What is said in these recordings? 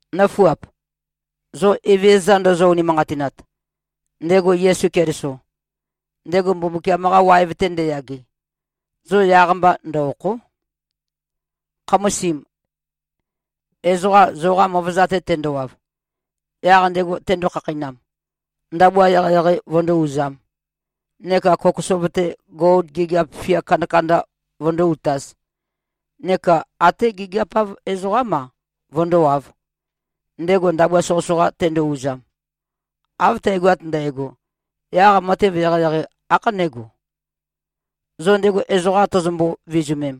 Nǿfuap! Zo Evezøza ndozo-unimanqatinat, ndego Yesu Keliso, ndego Mbumbukiam-qa waev-te ndeyage, zo yaq-mba ndø-òkho᷄. Khamasim, ezoqa zoqa møvøza-te tendowav, yaq ndego tendo-khakheinam, ndabua eqeieqei vøndó-uzām neka kokosov-te gol gigiap fia kandakanda vøndó-utāz, neka até gigiap-av ezoqám-a, vøndówāv, ndego ndabua soqøsoqa tendo-uzam; av tægoat ndægo, yaq matev eqeieqei ākhanégo? Zo ndego ezoqam tozombo-vizumem,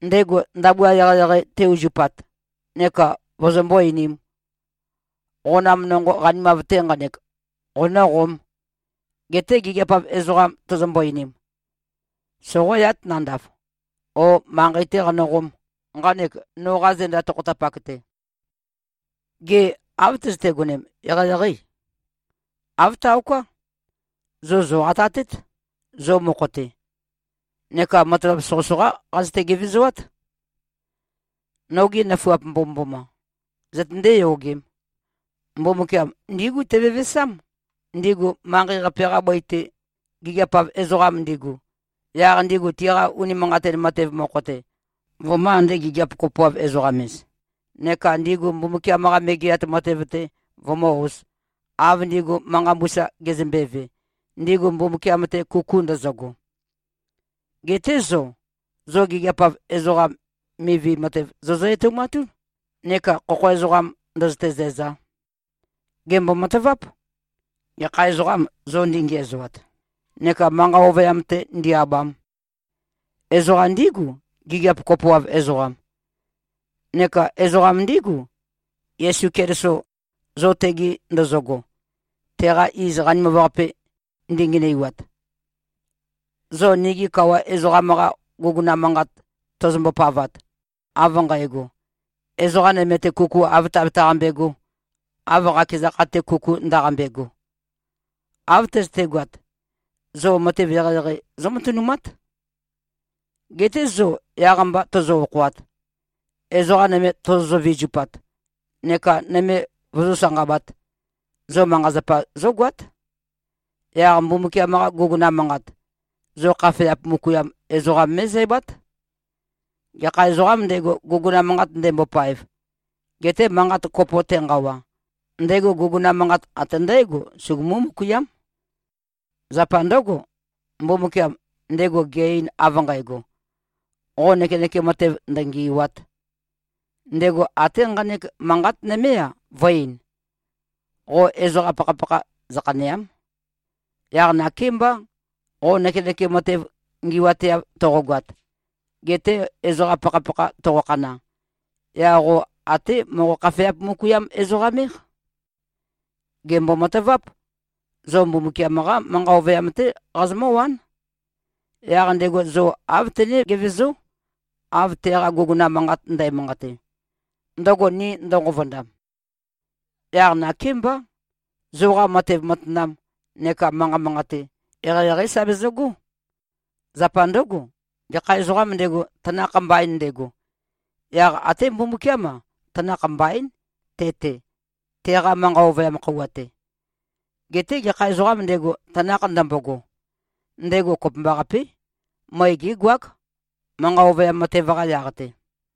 ndego ndabua eqeieqei te-uzupat neka vozombó-einīm, “Qonam nonqo qanimav-te nqanek, qonø̄qōm,” geté gigiap-av ezoqam tozombo-einim, “Soqōyāt nandav,” o “Manqei-tē qanøqōm, nqanek noqa zenda tokhotapak-te.” Gê, av tøzøte-gonem, eqeieqeî? Āv taoká. Zo zòqatatét, zo mokho-te. Neka matavap soqøsoqá qazøte-gevezoát. Nogi nøfuap mbomømboma! Zøtøndé-yogēm. Mbumbukiam ndígu tevevesám, ndigu manqei-qape-qa bøi-te gigiap-av ezoqam ndigu, yaq ndigu tiqa unimanqatin matev mokho-te, vømø̄-ande-gigiap-kopoav-ezoqam-ez, neka ndigu Mbumbukiam-qa Megeat Matev-te vømǿ-ōz, av ndigu manqa mbusa gezømbeve, ndigu Mbumbukiam-te kuku ndøzøgo. Geté zo, zo gigiap-av ezoqam mivi matev zozø-etoumatún, neka khokho ezoqam ndø̄zø̄tē-zǣzā. Gèmbo-mataváp. Gekha ezoqâm, zo ndingiæzoat, neka manqa ovøyam-te ndi-abam? Ezoqam ndígu, gigiap kopoav ezoqam. Neka ezoqam ndígu, Yesu Keliso, zo tegi ndozogo, teqa iz qanimav-qape ndingenøiwat. Zo nigi Kawa ezoqam-qa guguna manqat tozombo-pavat, av nqægo, “Ezoqa nøme-te, kuku āv tabetaqambe꞉gō, av qakeza kha-te kuku ndaqambe꞉go,” av tøzøtegoat, zo matev eqeieqei zómatønumát. Geté zo yaq-mba tozo-okhoat, ezoqa nøme tozozø-vizupat, neka nøme vozó-sanqabāt, zo manqa-zapa zógoát. Yaq Mbumbukiam-qa guguna manqat, zo khafeap møkuiam ezoqam mé꞉zæbát. Gekha ezoqām ndego, guguna manqat ndembopaev, gete manqat kopo tenqawa, ndego guguna manqat ate ndǽgo, sugumú-møkuiám. Zapa ndǿgo, Mbumbukiam, ndego ge-ein av nqægo, “Qo nøkenøkem matev ndøngì꞉wa᷄t,” ndego até nqanek manqat nømé-a, vø̄-ein, “Qo ezoqa pakhapakha zøkhanèa᷄m.” Yaq nakémbá, qo nøkenøkem matev ngi꞉wateav toqogoat, gete ezoqa pakhapakha toqokhana, yaq qo até moqo-khafeap-møkuiam-ezoqam-éq. Gèmbo-mataváp. Zo Mbumbukiam-qá manqa ovøyam-té qazomǿwán. Yaq ndego zo āv tené-gevezó, av teqa guguna manqat ndæmanqate, ndøgo ni ndønqovondam. Yaq nakémbá, zoqa matev matanam neka manqa manqate, eqeieqeí sa bezøgó. Zapa ndǿgo, gekha ezoqām ndego, tanakh mbain ndego, yaq até Mbumbukiám-a, tanakh mbaín, te-te, teqa manqa ovøyam khøuwa-te. Geté gekha ezoqām ndego, tanakh ndømbogo, ndego kopømbaqapé, møe gégoák, manqa ovøyam matev-qa yaq-te.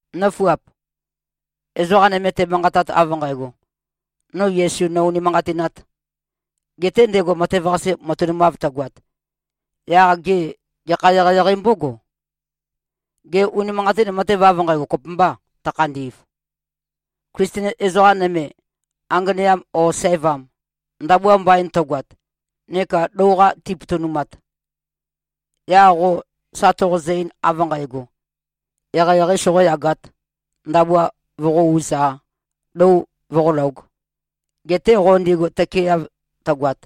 Nǿfuap! Ezoqa nøme temanqatat av nqægo, “No Yesu, nò-unimanqatināt,” gete ndego matev-qase matønumav tøgoat, yaq gê, gekha eqeieqei mbógo? Gê, unimanqatin matev av nqægo, kopømbâ, tøkhandi꞉v? Klisten ezoqa nøme, anganeam ō sævam, ndabua mbain tøgoat neka lou-qa tipotonumat, yaq qo sa toqozø-ein, av nqægo, “Eqeieqei soqōyagāt, ndabua voqó-ūz-a, lou voqólōg,” gete qo ndigu tøkeeav tøgoat,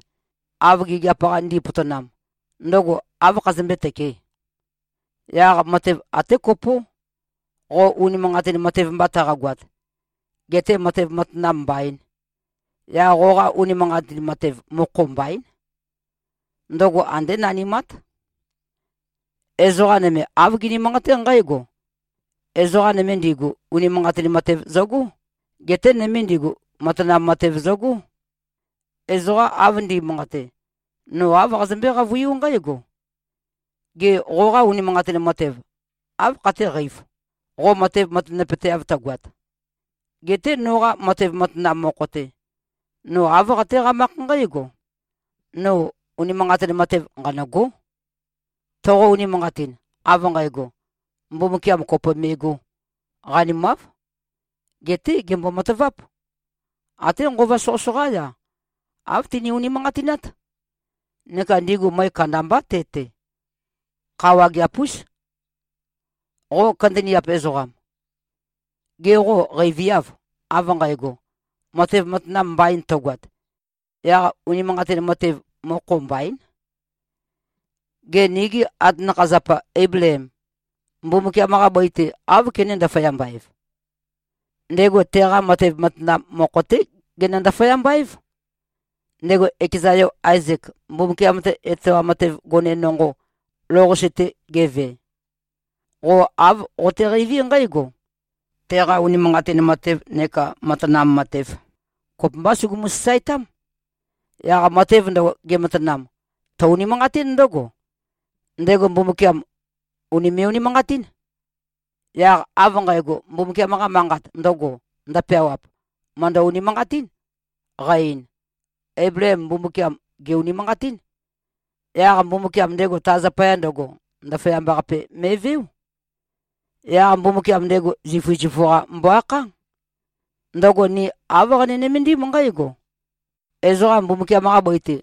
av gigiap-qa ndi꞉potonam, ndøgo áv khazømbé-tøkē? Yaq matev até kopó, qo unimanqatin matev mba taqagoat, gete matev matanam mbaīn, yaq qoqa unimanqatin matev, mokho mbaín. Ndøgo andé nanimát. Ezoqa nøme, āv gini-manqaté nqǽgo, “Ezoqa nøme ndigu, unimanqatin matev zøgó, geté nøme ndigu, matanam matev zøgó.” Ezoqa av ndi꞉manqate, no āv qazømbé-qavøiú nqǽgo, “Gê, qoqa unimanqatin matev áv khatéqeīv, qo matev matanapøteav tøgoat? Geté noqa matev matanam mokho-te, no āv qatéqamákh nqǽgo: No unimanqatin matev, nqanø̂gó.” Toqo-unimanqatin, av nqægo, Mbumbukiam kopo me꞉gō, qanimáv. Geté gèmbo-mataváp. Até nqova soqøsoqá-ya, āv tini-unimanqatinát. Neka ndigu møe kandambá te-te. Kha wageap-ús. Qo kandaniap ezoqam. Gê, qo qeiviâv, av nqægo: Matev matanam mbain tøgoat, yaq unimanqatin matev, mokho mbaín. Gê, nigi atanakha-zapa Eibleem, Mbumbukiam-qa bøi-te áv kené-ndaføyamba-ev? Ndego teqa matev matanam mokho-té genø-ndaføyamba-év, ndego ekeza yo Aezek, Mbumbukiam-te etoam matev gone nonqo, lou-qase-te geve. Qo āv qoteqeiví nqǽgo: Teqa unimanqatin matev neka matanam matev, kopømbá sugumu-sasaetám. Yaq matev ndøgo, gematanam, tø-unimanqatín ndǿgo: Ndego Mbumbukiam, ùnime꞉-unimanqatín. Yaq av nqægo, Mbumbukiam-qa Manqat ndøgo, ndøpeawap, mø̀ndø-unimanqatín, qa-ein, “Eibleem Mbumbukiam, gè-unimanqatín. Yaq Mbumbukiam ndego ta zapaya ndøgo, ndaføyamba-qape me꞉veó.” Yaq Mbumbukiam ndego zifu-zifu-qa mbo-akhá. Ndøgo ni āv qani-nømendim nqǽgo: Ezoqa Mbumbukiam-qa bøi-te,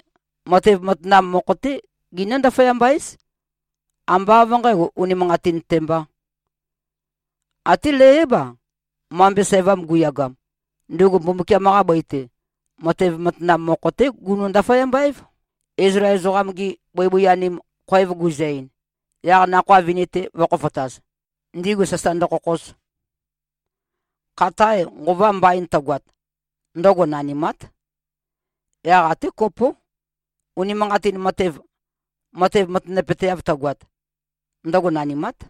matev matanam mokho-té ginǿ-ndaføyamba-éz, ambá av nqǣgo, unimanqatin-te mbā. Até Leiáb-a, mambe sævam guyagam, ndugu Mbumbukiam-qa bøi-te, matev matanam mokho-té gunø-ndaføyamba-év, Izlael ezoqam-gi bøibøi-anim, khoev guzø-ein, yaq nakhoa vini-te vø̄khofotaz, ndigu sasa ndøkhokhoz. Khatae nqova mbain tøgoat, ndøgo nanimát. Yaq até kopó, unimanqatin matev, matev matanapøteav tøgoat, ndøgo nanimát.